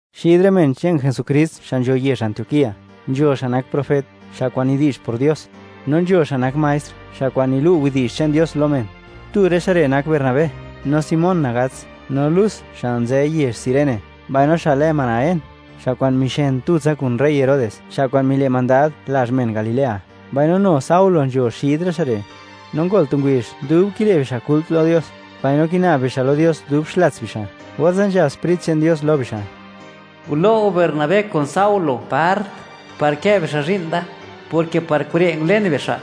Xid rë men che'n Jesukrist xa' nzho yezh Antioquía, nzho xa' nak profet, xa' kwa'n nidi'zh por Dios, no nzho xa' nak maestr, xa' kwa'n nilu' widi'zh che'n Dios lo men. Tu rë xa' re' nak Bernabé, no Simón Triyeñ, no Lus, xa' nzë yezh Cirene, mbaino xa' lë Manaén, xa' kwa'n mixen tutsa kun gobiernador Herodes, xa' kwa'n mile' mandad lazh men Galilea, mbaino nu Saulo nzho xid rë xa' re'. No ngol tu ngubizh, dub kile' bixa' kult lo Dios, mbaino kina'b bixa' lo Dios dub xlats bixa', orze' nzhab Sprit che'n Dios lo bixa': ―Gulo' go Bernabé kun Saulo part, par kë bixa' zhi'n da, porke par kure' ngulen bixa'.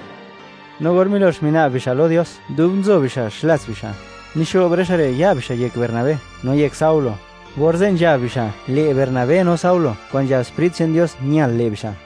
No or milox mina'b bixa' lo Dios dub nzo bixa' xlats bixa', mixo'b rë xa' re' ya' bixa' yek Bernabé no yek Saulo, orze' nzhab bixa', le' Bernabé no Saulo, kwa'n nzhab Sprit che'n Dios ñal le' bixa'.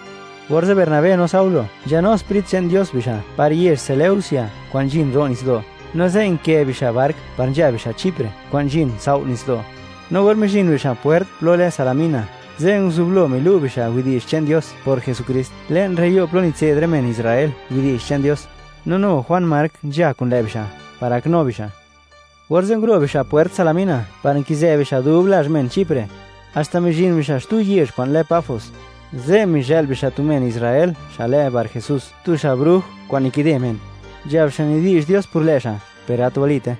Orze' Bernabé no Saulo nzhanu Sprit che'n Dios bixa', par yezh Seleucia kwa'n nzhin ro' nitsdo', no ze' nkë bixa' bark par nzha bixa' Chipre, kwa'n nzhin tsao' nitsdo'. No or mizhin bixa' pwert plo lë Salamina, ze' nguzublo milu' bixa' widi'zh che'n Dios por Jesukrist, le'n rë yo' plo nitse'd rë men Israel widi'zh che'n Dios. No nu Juan Mark, nzha kun lë' bixa', par gaknu bixa'. Orze' nguro' bixa' pwert Salamina par nkizë bixa' dub lazh men Chipre, haxta mizhin bixa' xtu yezh kwa'n lë Pafos. Ze' mizhë'l bixa' tu men Israel xa' lë Barjesús, tu xa' bruj kwa'n nikide men; nzhab xa' nidi'zh Dios por lë' xa', per gat walite.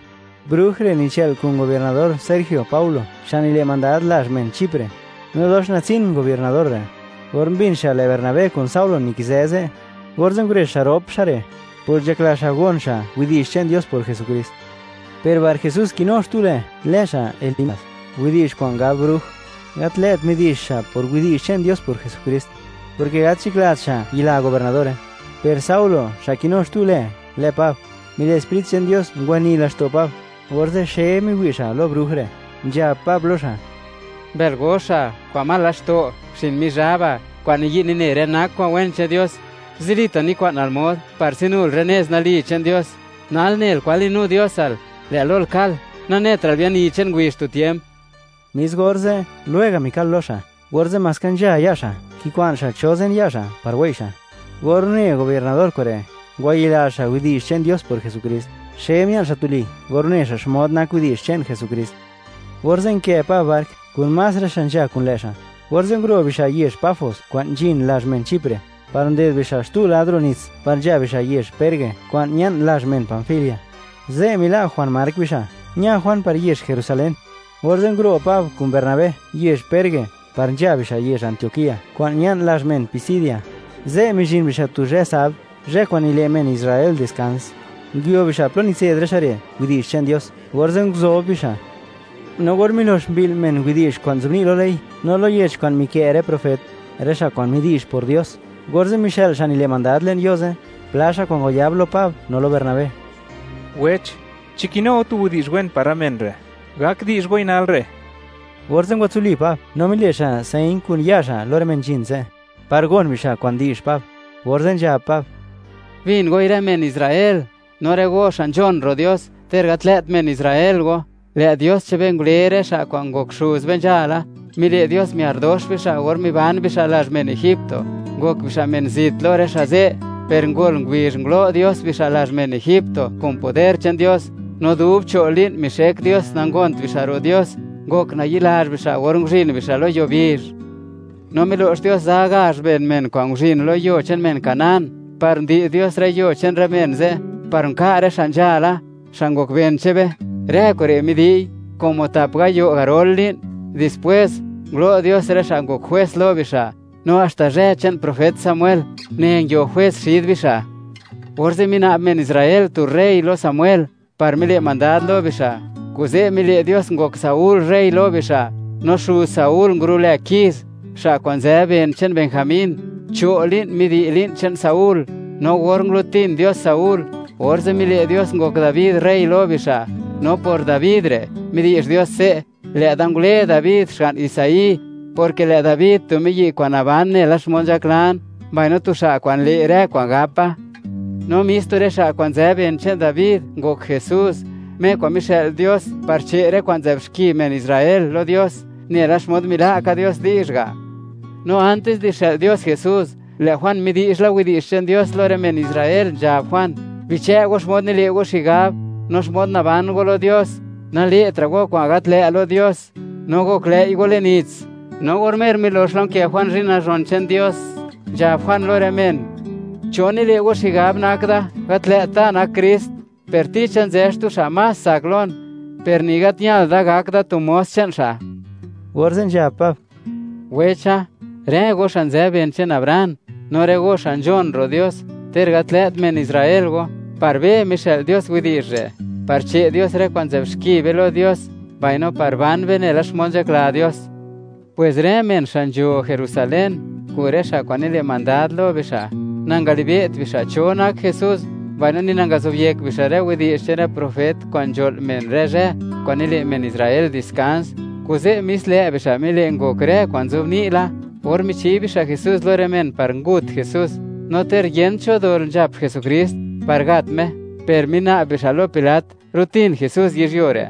Bruj re' nichë'l kun gobiernador Sergio Paulo, xa' nile' mandad lazh men Chipre. No dox natsin gobiernador re'. Or mbin xa', lë' Bernabé kun Saulo nikizë ze', orze' ngurezh xa' rop xa' re', por nzhakla xa' gon xa' widi'zh che'n Dios por Jesukrist. Per Barjesús kinu xtu lë, lë xa' Elimas (widi'zh kwa'n gab bruj); gat lë't midi'zh xa' por widi'zh che'n Dios por Jesukrist, porke gat nzhaklat xa' yila gobiernadore. Per Saulo, xa' nu kinu xtu lë, lë Pab; mile' Sprit che'n Dios ngwani laxto' Pab, orze' xe miwi' xa' lo bruj re', nzhab Pab lo xa': ―¡Mbël goxa, kwa'n mal laxto', xin Mizhaba, kwa'n niyi' nine rë nak kwa'n wen che'n Dios! ¡Zilita' nikwa'nal mod, par tsinul rë nez nali che'n Dios! Nal nel kwan li'nu Diosal, lë' lol kal, nanetra'l biani che'n ngubizh tu tiemp. Mis orze', lwega' mikal lo xa', orze' maska nzha ya' xa', kikwa'n xa' cho zen ya' xa' par wei' xa'. Or une gobiernador kure', ngwayila xa' widi'zh che'n Dios por Jesukrist, xe mia'n xa' tuli or une xa' xmod nak widi'zh che'n Jesukrist. Orze' nkë Pab bark, kun más rë xa' nzha kun lë' xa'; orze' nguro' bixa' yezh Pafos kwa'n nzhin lazh men Chipre, par nded bixa' xtu lad ro' nits par nzha bixa' yezh Perge, kwa'n ña'n lazh men Panfilia. Ze' mila' Juan Mark bixa', ña Juan par yezh Jerusalén. Orze' nguro' Pab kun Bernabé yezh Perge par nzha bixa' yezh Antioquía kwa'n ña'n lazh men Pisidia. Ze' mizhin bixa' tu zhë sabd, zhë kwa'n nile' men Israel diskans. Nguio bixa' plo nitse'd rë xa' re' widi'zh che'n Dios, orze' nguzob bixa'. No or milox mbi'l men widi'zh kwa'n nzobni' lo ley, no lo yech kwa'n mikë' rë profet, rë xa' kwa'n midi'zh por Dios, orze' mixë'l xa' nile' mandad le'n yo' ze', pla xa' kwa'n ngwayab lo Pab no lo Bernabé: ―Wech; chi kinu go tu widi'zh wen par rë men re', gak di'zh goi nal re'. Orze' ngwatsuli Pab, no mile' xa' señ kun ya' xa' lo rë men nzhin ze', par gon bixa' kwan di'zh Pab, orze' nzhab Pab: ―Bin goi rë men Israel, no rë go xa' nzhon ro' Dios, ter gat lë't men Israel go: Lë' Dios che'n be ngule rë xa' kwa'n ngok xuz be nzhala, mile' Dios miar dox bixa' or miban bixa' lazh men Egipto, ngok bixa' men zit lo rë xa' ze', per ngol ngubizh ngulo' Dios bixa' lazh men Egipto kun poder che'n Dios. No dub cho' li'n mixek Dios nangont bixa' ro' Dios, ngok nayi'lazh bixa' or nguzhin bixa' lo yuo bizh. No milo'x Dios za gazh ben men, kwa'n nguzhin lo yuo che'n men Canaán, par ndi'z Dios rë yuo che'n rë men ze', par nka' rë xa' nzhala, xa' ngok ben che'n be. Rë kure' midi'y como tap gayo' garol li'n. Dispwés, ngulo Dios rë xa' ngok jwes lo bixa', no haxta zhë che'n profet Samuel, une nguio jwes xid bixa'. Orze' mina'b men Israel tu rey lo Samuel, par le' mandad lo bixa'. Kuze' mile' Dios ngok Saúl rey lo bixa'; no xuz Saúl ngurulë Kis, xa' kwa'n nzë ben che'n Benjamín; cho' li'n midi'y li'n che'n Saúl. No or ngulutin Dios Saúl, orze' mile' Dios ngok Dabi rey lo bixa'. No por Dabi re' midi'zh Dios se': “Lë'da ngule Dabi xga'n Isaí, porke lë' Dabi tu miyi' kwa'n naban nela xmod nzhaklan, mbaino tu xa' kwa'n le' rë kwa'n gapa.” No mis tu rë xa' kwa'n nzë ben che'n Dabi ngok Jesús, Me kwa'n mixë'l Dios par che' rë kwa'n nzë'b xki men Israel lo Dios, nela xmod mila' ka Dios di'zh ga'. No antis di xë'l Dios Jesús, lë' Juan midi'zh la widi'zh che'n Dios lo rë men Israel, nzhab Juan: “Bichë' go xmod nile' go xigab, no xmod naban go lo Dios, nale'tra' go kwa'n gat lë' lo Dios, no goklëi' go le'n nits.” No or mer milox la nkë Juan zhi'n nazhon che'n Dios, nzhab Juan lo rë men: “¿Cho nile' go xigab nak da? Gat lë't da nak Krist, per ticha nzë xtu xa' más tsak lon, per ni gat ñal da gak da tu mos che'n xa'.” Orze' nzhab Pab: ―Wecha, rë go xa' nzë ben che'n Abraham, no rë go xa' nzhon ro' Dios, ter gat lë't men Israel go: Par be mixë'l Dios widi'zh re', par che' Dios rë kwa'n nzë'b xki be lo Dios, mbaino par ban be nela xmod nzhakla Dios. Pwes rë men xa' nzho Jerusalén, kun rë xa' kwa'n nile' mandad lo bixa', nangalibe't bixa' cho nak Jesús, mbaino ni nangazobyekt bixa' rë widi'zh che'n rë profet kwa'n nzho'l men rë zhë kwa'n nile' men Israel diskans. Kuze', mis lë' bixa' mile' ngok rë kwa'n nzobni' la, or michi bixa' Jesús lo rë men par ngut Jesús. No ter yent cho dol nzhap Jesukrist, par gat Me, per mina'b bixa' lo Pilat, rutin Jesús yizhyuo re'.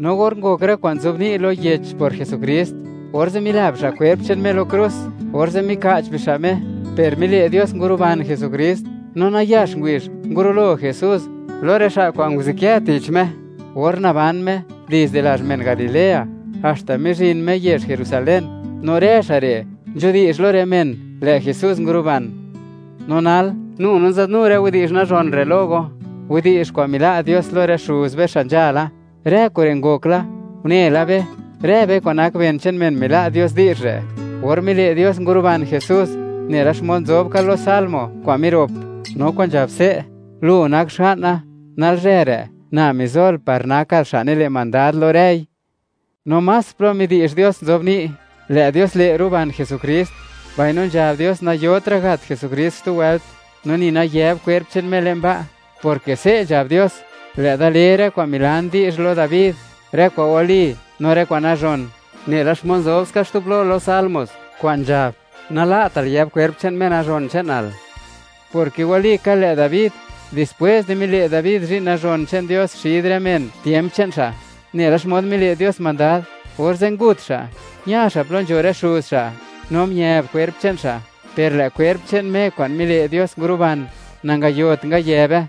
No or ngok rë kwa'n nzobni' lo yech por Jesukrist, orze' mila bixa' kwerp che'n Me lo krus, orze' mika'ch bixa' Me. Per mile' Dios nguruban Jesukrist, no nayax ngubizh, ngurulo Jesús lo rë xa' kwa'n nguzukë tich Me, or naban Me, dizde lazh men Galilea, haxta mizhin Me yezh Jerusalén. No rë xa' re' nzhudi'zh lo rë men, lë' Jesús nguruban. ’No nal, nu no nzadnu rë widi'zh nazhon rë lo go, widi'zh kwa'n mila' Dios lo rë xuz be xa' nzhala. Rë kure' ngok la, une la be, rë be kwa'n nak ben che'n men mila' Dios di'zh re', or mile' Dios nguruban Jesús, nela xmod nzobni' ka lo Salmo kwa'n mirop kwa'n nzhab se': “Lu nak Xga'na. Nalzhë re' Na mizol, par nakal Xa' nile' mandad lo rëi.” No más plo midi'zh Dios nzobni', lë' Dios le' ruban Jesukrist, mbaino nzhab Dios nayotra' gat Jesukrist xtu wëlt, no ni nayëb kwerp che'n Me le'n ba', porke se' nzhab Dios: “Lë'da le rë kwa'n milan di'zh lo Dabi, rë kwa'n wali no rë kwa'n nazhon”, nela xmod nzob ska xtu plo lo Salmos, kwa'n nzhab: “Nala'tal yëb kwerp che'n Me Nazhon che'nal”, porke walika lë' Dabi, dispwés di mile' Dabi zhi'n nazhon che'n Dios xid rë men tiemp che'n xa', nela xmod mile' Dios mandad, orze' ngut xa', ña xa' plo nzho rë xuz xa', no miëb kwerp che'n xa'. Per lë' kwerp che'n Me kwa'n mile' Dios nguruban, nangayot ngayëbe.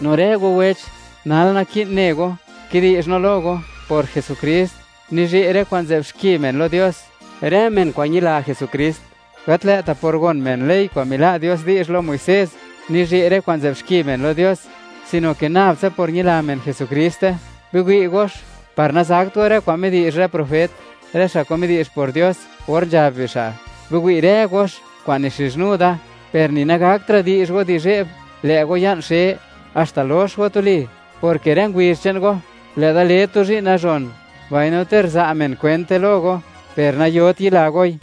No rë go wech, nal naki'n ne go, kidi'zh no lo go: Por Jesukrist nizhe' rë kwa'n nzë'b xki men lo Dios, rë men kwa'n ñila Jesukrist. Gat lë'ta' por gon men ley kwa'n mila' Dios lo Muisés nizhe' rë kwa'n nzë'b men lo Dios, sino ke nab tsa por ñila men Jesukriste. Biwi' gox, par nazakt go, rë kwa'n midi'zh rë profet, rë xa' kwa'n midi'zh por Dios or nzhab bixa': Biwi' rë gox kwa'n nixizhnu Da. Per ni nagakra' di'zh go di zhe'b, lë' go ya'n xe, haxta lox go tuli, porke rë ngubizh che'n go, lë' Da le tu zhi'n nazhon, mbaino ter za' men kwente lo go, per nayot yila goi.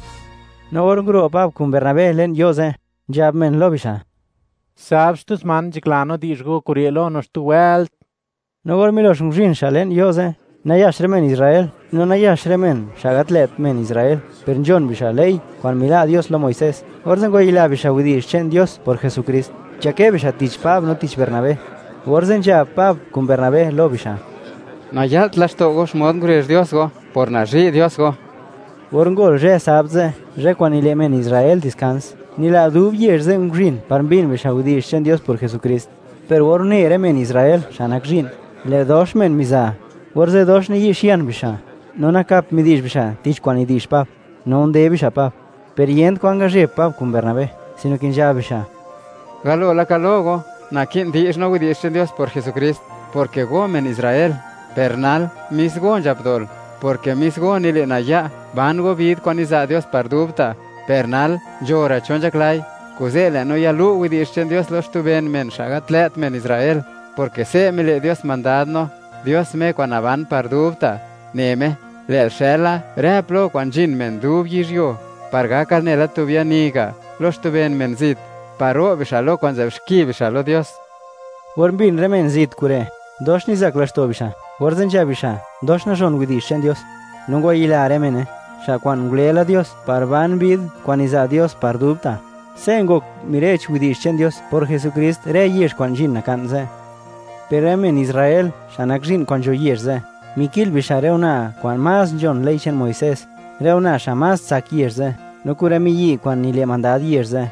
No or nguro' Pab kun Bernabé le'n yo' ze', nzhab men lo bixa': ―Sabd xtu sman, nzhakla no di'zh go kure' lo no xtu wëlt. No or milox nguzhin xa' le'n yo' ze', nayax rë men Israel no nayax rë men xa' gat lë't men Israel per nzhon bixa' ley kwa'n mila' Dios lo Muisés, orze' ngwayila bixa' widi'zh che'n Dios por Jesukrist, nzhakë bixa' tich Pab no tich Bernabé. Orze' nzhab Pab kun Bernabé lo bixa': ―Naya'lt laxto' go xmod ngurezh Dios go, por nazhi' Dios go. Or ngol zhë Sabd ze', zhë kwa'n nile' men Israel diskans, nila' dub yezh ze' nguzhin par mbin bixa' widi'zh che'n Dios por Jesukrist. Per or une rë men Israel xa' nak zhi'n, lë' dox men miza, orze' dox niyi'xian bixa', no nakap midi'zh bixa' tich kwa'n nidi'zh Pab, no unde bixa' Pab, per yent kwan ngazheb Pab kun Bernabé, sino ke nzhab bixa': ―Galo laka lo go, naki'n di'zh no widi'zh che'n Dios por Jesukrist, porke go men Israel. Per nal, mis go nzhap dol, porke mis go nile' naya', ban go bid kwa'n niza' Dios par dubta'. Per nal nzho ra' xa' nzhaklai, kuze' lë' no yalu' widi'zh che'n Dios lo xtu ben men, xa' gat lë't men Israel, porke se' mile' Dios mandad no, Dios Me kwa'n naban par dubta', ne Me: Lë'l xëla rë plo kwa'n nzhin men dub yizhyuo, par gakal nela tu biani ga' lo xtu ben men zit, par ro' bixa' lo kwa'n nzë'b xki bixa' lo Dios. Or mbin rë men zit kure', dox nizak laxto' bixa', orze' nzhab bixa': “Dox nazhon widi'zh che'n Dios”; no ngwayila rë mene, xa' kwa'n ngule la Dios, par ban bid kwa'n niza' Dios par dubta'. Se' ngok mire'ch widi'zh che'n Dios por Jesukrist rë yezh kwa'n nzhin naka'n ze', per rë men Israel xa' nak zhi'n kwa'n nzho yezh ze', miki'l bixa' rë una' kwa'n más nzhon ley che'n Muisés, rë una' xa' más tsak yezh ze', no kun rë miyi' kwa'n nile' mandad yezh ze'.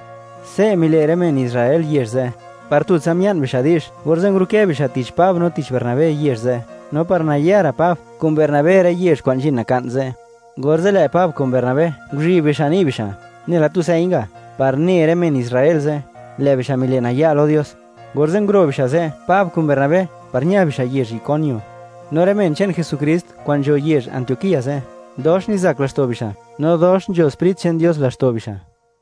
Se' mile' rë men Israel yezh ze', par tutsa mia'n bixa' di'zh, orze' ngurukë bixa' tich Pab no tich Bernabé yezh ze', no par nayara' Pab kun Bernabé rë yezh kwa'n nzhin naka'n ze'. Orze' lë' Pab kun Bernabé, nguzhib bixa' ni' bixa', nela tu señ ga', par ne rë men Israel ze', lë' bixa' mile' naya' lo Dios. Orze' nguro' bixa' ze', Pab kun Bernabé, par ña bixa' yezh Iconio. No rë men che'n Jesukrist kwa'n nzho yezh Antioquía ze', dox nizak laxto' bixa', no dox nzho Sprit che'n Dios laxto' bixa'.